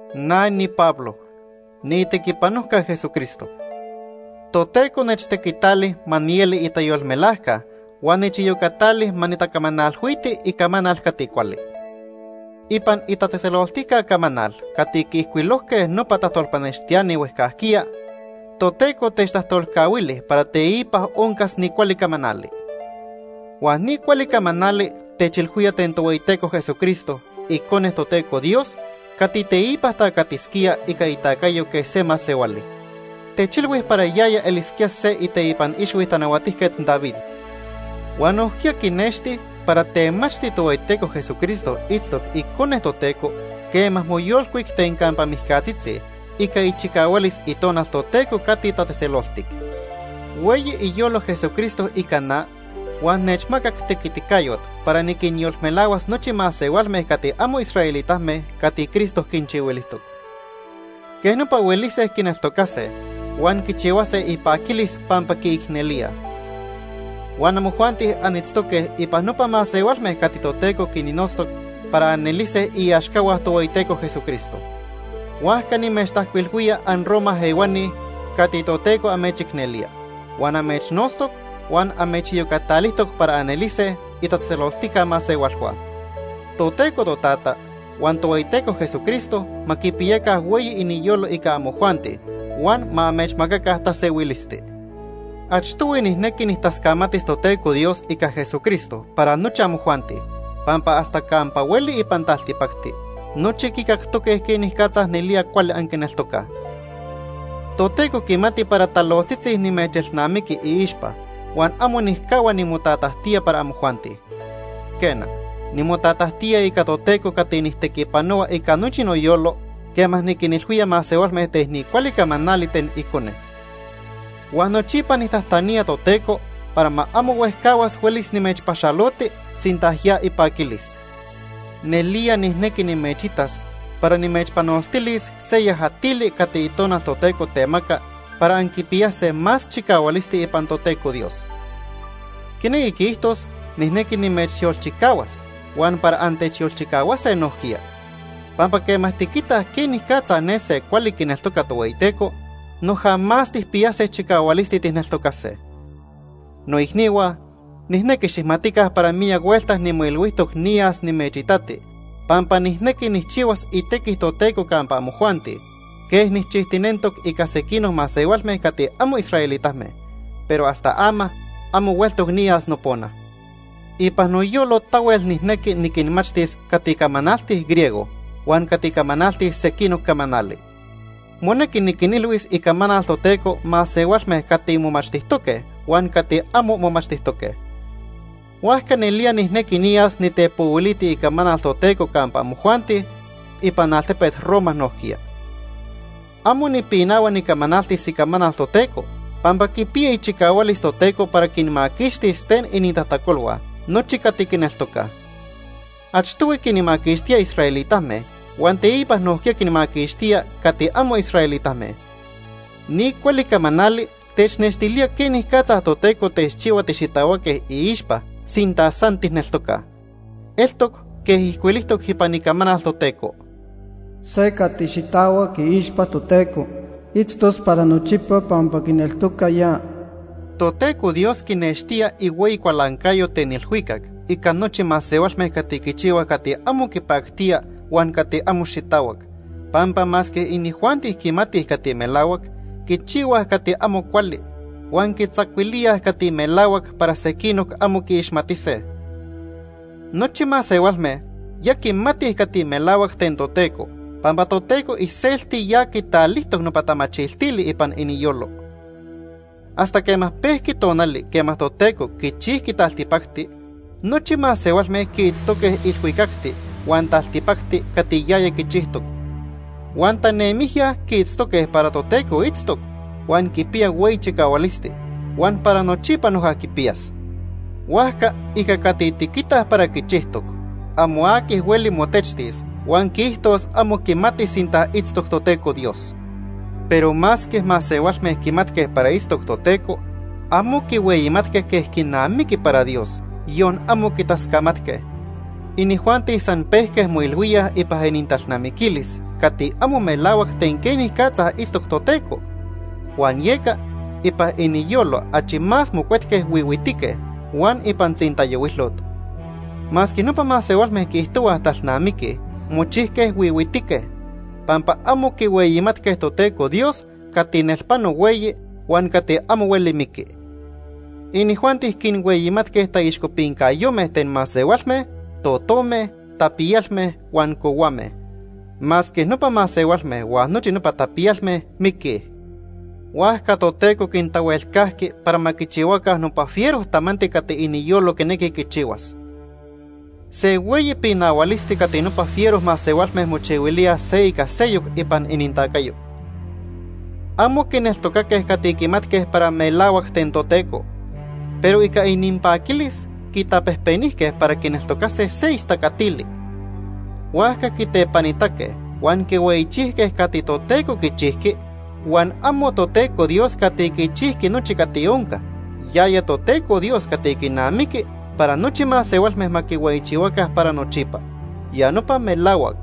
Na niPablo. Niitequipanojca Jesucristo. Toteco nechtequitali ma nieli itayolmelajca huan nechiyocatali ma nitacamanalhuiti icamanal cati cuali. Ipan Itatzejtzeloltijca Camanal cati quiijcuilojque nopa tajtolpanextiani huejcajquiya, Toteco techtajtolcahuili para teipa oncas ni cuali camanali. Huan ni cuali camanali techilhuía ten Tohueyiteco Jesucristo, Icone Toteco Dios cati teipa tacatisquía ica itacayo quej se masehuali. Techilhui para yaya elisquía se iteipan ixhui Tanahuatijquet David. Huan nojquiya quinexti para temachti Tohueyiteco Jesucristo itztoc Icone Toteco quema moyolcuic ten campa mijcatzitzi ica ichicahualis Itonal Toteco cati tatzejtzeloltic. Hueyi iyolo Jesucristo ica na huan nechmacac tequiticayot para niquinyolmelahuas nochi masehualme cati amo israelitame cati Cristo quinchihuilijtoc. Quej nopa huelise quineltocase huan quichihuase ipaquilis pampa quiicnelíaj. Huan amojuanti anitztoque ipan nopa masehualme cati Toteco quinnotztoc para anelise iaxcahua Tohueyiteco Jesucristo. Huajca nimechtajcuilhuía anRoma ehuani cati Toteco amechicnelía, huan amechnotztoc, huan amechiyocatalijtoc para anelise itatzejtzeloltica masehualhua. Toteco Totata huan Tohueyiteco Jesucristo ma quipiyaca hueyi iniyolo ica amojuanti huan ma amechmacaca tasehuilisti. Achtohui nijnequi nijtascamatis Toteco Dios ica Jesucristo para nochi amojuanti, pampa hasta campa hueli ipan taltipacti, nochi quicactoque quenicatza nelía cuali anquineltocaj. Toteco quimati para talojtzitzi nimechelnamiqui iixpa huan amo nijcahua nimotatajtía para amojuanti. Quena, nimotatajtía ica Toteco cati nijtequipanohua ica nochi noyolo quema niquinilhuía masehualme ten ni cuali camanali ten Icone. Huan nochipa nijtajtanía Toteco para ma amo huejcahuas huelis nimechpaxaloti sinta ya ipaquilis. Nelía nijnequi nimechitas para nimechpanoltilis se yajatili cati Itonal Toteco temaca para anquipiyase más chicahualisti ipan Toteco Dios. Quinequi quiijtos nijnequi nimechyolchicahuas huan para antechyolchicahuase nojquiya. Pampa quema tiquitaj quenicatza ne se cuali quineltoca Tohueyiteco, noja más tijpiyase chicahualisti tijneltocase. Noicnihua, nijnequi xijmatica para miyac huelta nimoilhuijtoc niyas nimechitati pampa nijnequi nijchihuas itequi Toteco campa amojuanti quej nijchijtinentoc ica sequinoc masehualme cati amo israelitame, pero hasta ama amo hueltoc niyas nopona. Ipan noyolo tahuel nijnequi niquinmachtis cati camanaltij griego huan cati camanaltij sequinoc camanali. Monequi niquinilhuis icamanal Toteco masehualme cati momachtijtoque huan cati amo momachtijtoque. Huajca nelía nijnequi niyas nitepohuiliti icamanal Toteco campa amojuanti ipan altepet Roma nojquiya. Amo nipinahua nicamanaltis icamanal Toteco, pampa quipiya ichicahualis Toteco para quinmaquixtis ten inintajtacolhua nochi cati quineltocaj. Achtohui quinmaquixtía israelitame huan teipa nojquiya quinmaquixtía cati amo israelitame. Ni cuali camanali technextilía quenicatza Toteco techchihua tixitahuaque iixpa sinta san tijneltocaj. Eltoc quej ijcuilijtoc ipan Icamanal Toteco: “Se cati xitahuac iixpa Toteco, itztos para nochipa pampa quineltoca ya.” Toteco Dios quinextía ihueyi cualancayo ten ilhuicac ica nochi masehualme cati quichihuaj cati amo quipactía huan cati amo xitahuac, pampa masque inijuanti quimatij cati melahuac, quichihuaj cati amo cuali, huan quitzacuilíaj cati melahuac para sequinoc amo quiixmatise. Nochi masehualme ya quimatij cati melahuac ten Toteco pampa Toteco iselti ya quitalijtoc nopa tamachiltili ipan iniyolo. Hasta quema pejque tonali quema Toteco quichijqui taltipacti, nochi masehualme quiitztoque ilhuicacti huan taltipacti cati yaya quichijtoc. Huan tanemijya quiitztoque para Toteco itztoc, huan quipiya hueyi chicahualisti, huan para nochipa noja quipiyas. Huajca ica cati tiquitaj para quichijtoc, amo aqui hueli motechtis huan quiijtos amo quimati sinta itztoc Toteco Dios. Pero masque masehualme quimatque para itztoc Toteco, amo quihueyimatque quej quinamiqui para Dios, yon amo quitascamatque. Inijuanti san pejque moilhuíaj ipan inintalnamiquilis cati amo melahuac ten quenicatza itztoc Toteco, huan yeca ipan iniyolo achi más mocuetque huihuitique huan ipan tzintayohuilot. Masque nopa masehualme quiijtohuaj talnamiquij, mochijque huihuitique, pampa amo quihueyimatque Toteco Dios cati nelpano hueyi huan cati amo hueli miqui. Inijuanti quinhueyimatque taixcopincayome ten masehualme, totome, tapiyalme huan cohuame. Masque nopa masehualme huan nochi nopa tapiyalme miquij. Huajca Toteco quintahuelcajqui para ma quichihuaca nopa fiero tamanti cati iniyolo quinequi quichihuas. Se hueyi pinahualisti cati nopa fiero masehualme mochihuilíaj se ica seyoc ipan inintacayo. Amo quineltocaque cati quimatque para melahuac ten Toteco. Pero ica ininpaquilis quitapejpenijque para quineltocase se istacatili. Huajca quitepanitaque huan quihueyichijque cati Toteco quichijqui huan amo Toteco Dios cati quichijqui nochi cati onca, yaya Toteco Dios cati quinamiqui para nochi masehualme ma quihueyichihuaca para nochipa. Ya nopa melahuac.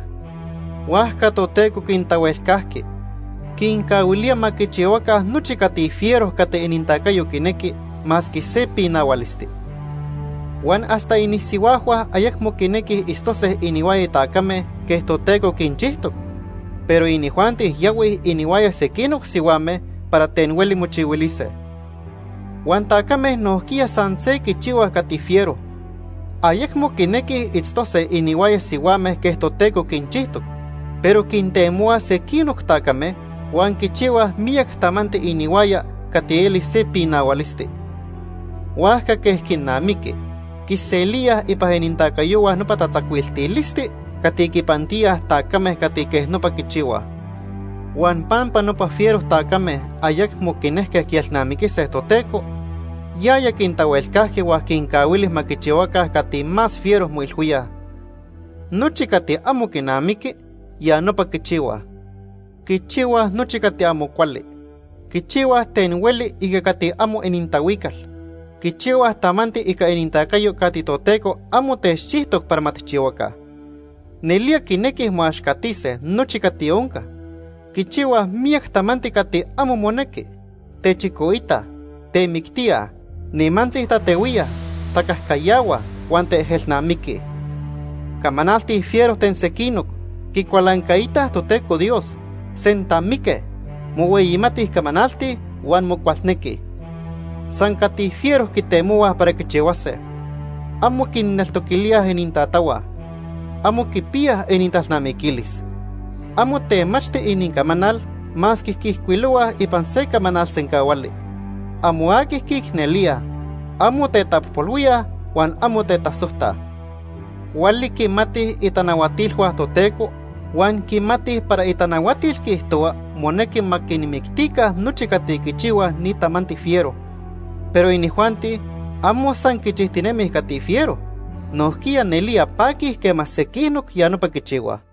Huajca Toteco quintahuelcajqui. Quincahuilía ma quichihuaca nochi cati fiero cati inintacayo quinequi, masque se pinahualisti. Huan hasta inisihuajhua ayecmo quinequij itztose inihuaya tacame quej Toteco quinchijtoc, pero inijuanti yahuij inihuaya sequinoc sihuame para ten hueli mochihuilise. Huan tacame nojquiya san se quichihuaj cati fiero. Ayecmo quinequij itztose inihuaya sihuame quej Toteco quinchijtoc, pero quintemohuaj sequinoc tacame huan quichihuaj miyac tamanti inihuaya cati eli se pinahualisti. Huajca quej quinamiqui, quiselíaj ipan inintacayohua nopa tatzacuiltilisti cati quinpantíaj tacame cati quej nopa quichihuaj. Huan pampa nopa fiero tacame ayecmo quinejque quielnamiquise Toteco, yaya quintahuelcajqui huan quincahuili ma quichihuaca cati más fiero moilhuíaj. Nochi cati amo quinamiqui, ya nopa quichihuaj. Quichihuaj nochi cati amo cuali. Quichihuaj ten hueli ica cati amo inintahuical. Quichihuaj tamanti ica inintacayo cati Toteco amo techchijtoc para ma tijchihuaca. Nelía quinequij moaxcatise nochi cati onca. Quichihuaj miyac tamanti cati amo monequi. Techicoitaj, temictíaj, nimantzi tatehuíaj, tacajcayahuaj, huan teejelnamiquij. Camanaltij fiero ten sequinoc. Quicualancaitaj Toteco Dios. Sentamique. Mohueyimatij camanaltij huan mocualnequij. San cati fiero quitemohuaj para quichihuase. Amo quinneltoquilíaj inintatahua. Amo quipiyaj inintalnamiquilis. Amo temachti inincamanal masque quiijcuilohuaj ipan se camanal sencahuali. Amo aqui quiicnelíaj. Amo tetapojpolhuíaj huan amo tetasojtaj. Cuali quimatij itanahuatilhua Toteco huan quimatij para itanahuatil quiijtohua monequi ma quinmictica nochi cati quichihuaj ni tamanti fiero. Pero inijuanti amo san quichijtinemij cati fiero, nojquiya nelía paquij quema sequinoc ya nopa quichihuaj.